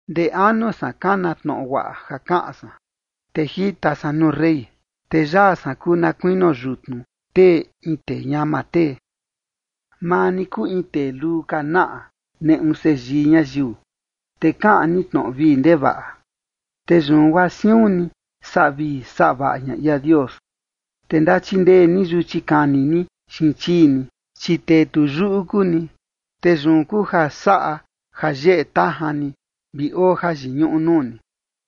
Ndee anu san kana tnoꞌo guaꞌa ja kaꞌan san, te jita san nuu rey. Te yaa san kuu na kuinio yutnu tee in tee ñama tee. Maa ni kuu in tee luu ka naꞌa neꞌu seyii ñayiu, te kaꞌan ni tnoꞌo vii ndevaꞌa, te yun guaa siun ni saꞌa vii saꞌa vaꞌa ña ia Dios. Te ndachindee ni yuchi kani ni xiin chii ni, chi tee tu yuꞌu kuu ni, te yun kuu ja saꞌa ja yeꞌe tajan ni vi oo jayiñuꞌu nuu ni.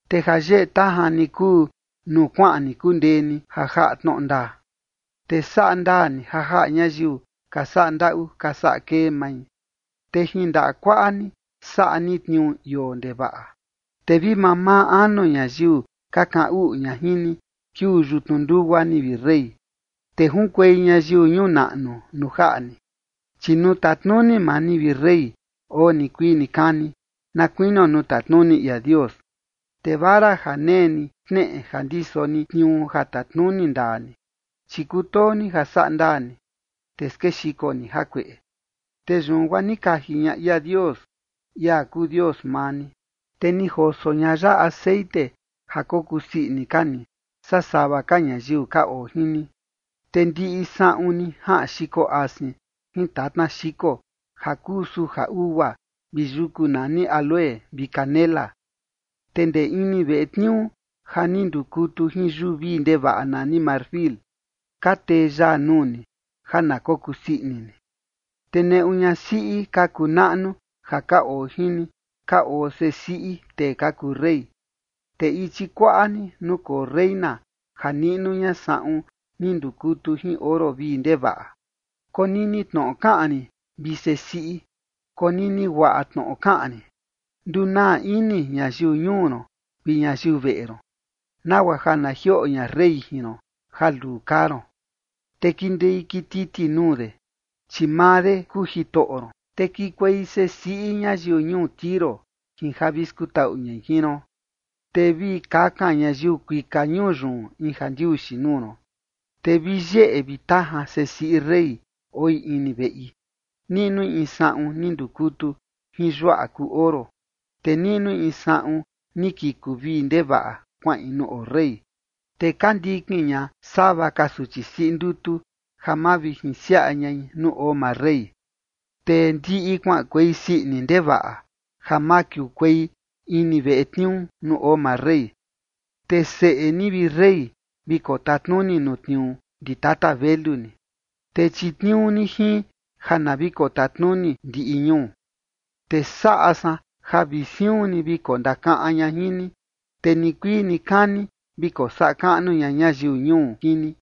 Te ja yeꞌe tajan ni kuu nuu kuaꞌan ni kundee ni ja jaꞌa tnoꞌo ndaa, te saꞌa ndaa ni ja jaꞌa ñayiu ka saꞌa ndaꞌu ka saꞌa kee mai. Te jin ndaꞌa kuaꞌa ni saꞌa ni tniuu ioo ndevaꞌa. Te vi mamaa anu ñayiu ka kaꞌan uꞌu ña jin ni, kiuu yutnu ndugua ni, vi rey, te junkuei ñayiu ñuu naꞌnu nuu jaꞌa ni. Chi nuu tatnuni maa ni, vi rey, oo nikuii nikani, na kuinio nuu tatnuni ia Dios, te vara ja nee ni xneꞌe ja ndiso ni tniuu ja tatnuni ndaa ni. Chi kutoo ni ja saꞌa ndaa ni, te skexiko ni jakueꞌe, te yun guaa ni kaji ña ia Dios, ia kuu Dios maa ni, te ni joso ña ya texeꞌen ja kokusii ini ka ni, saa sava ka ñayiu ka oo jin ni. Te ndiꞌi saꞌun ni jaꞌan xiko asin jin tatna xiko ja kuu suja ugua vi yuku nani áloe vi canela. Te ndee ini veꞌe tniuu ja ni ndukutu jin yuu vii ndevaꞌa nani marfil, ka tee yaa nuu ni, ja na kokusii ini ni. Te neꞌu ñasiꞌi ka kuu naꞌnu ja ka oo jin ni, ka oo sesiꞌi tee ka kuu rey, te ichi kuaꞌa ni, nukoo reina ja niꞌnu ña saꞌun ni ndukutu jin oro vii ndevaꞌa. Konini tnoꞌo kaꞌan rin, vi sesiꞌi, konini guaꞌa tnoꞌo kaꞌan rin. Ndunaa ini ñayiu ñuu ron vi ñayiu veꞌe ron, nagua ja na jioꞌo ña rey jin ron ja luu kaa ron, te kindei kititi nuu de, chi maa de kuu jitoꞌo ron. Te kikuei sesiꞌi ñayiu ñuu Tiro jin ja vi skutaꞌu ñai jin ron, te vi kakan ñayiu kuika ñuu yun in jandiuxi nuu ron. Te vi yeꞌe vi tajan sesiꞌi rey oi ini veꞌi, niꞌnui in saꞌun ni ndukutu jin yuaꞌa kuu oro. Te niꞌnui in saꞌun ni kiku vii ndevaꞌa kuaꞌin nuu oo rey, te ka ndikin ña sava ka suchi siꞌi ndutu, ja mavijinsiaꞌa ñai nuu oo maa rey. Te ndiꞌi kuaꞌankuei sii ini ndevaꞌa ja makiukuei ini veꞌe tniuu nuu oo maa rey. Te seꞌe ni, vi rey, vi kotatnuni nuu tniuu ndi tata velu ni, te chitniuu ni jin ja na vi kotatnuni ndiꞌi ñuu. Te saꞌa san ja vi siun ni vi kondakaꞌan ña jin ni, te nikuii nikani vi kosaꞌa kaꞌnu ña ñayiu ñuu jin ni.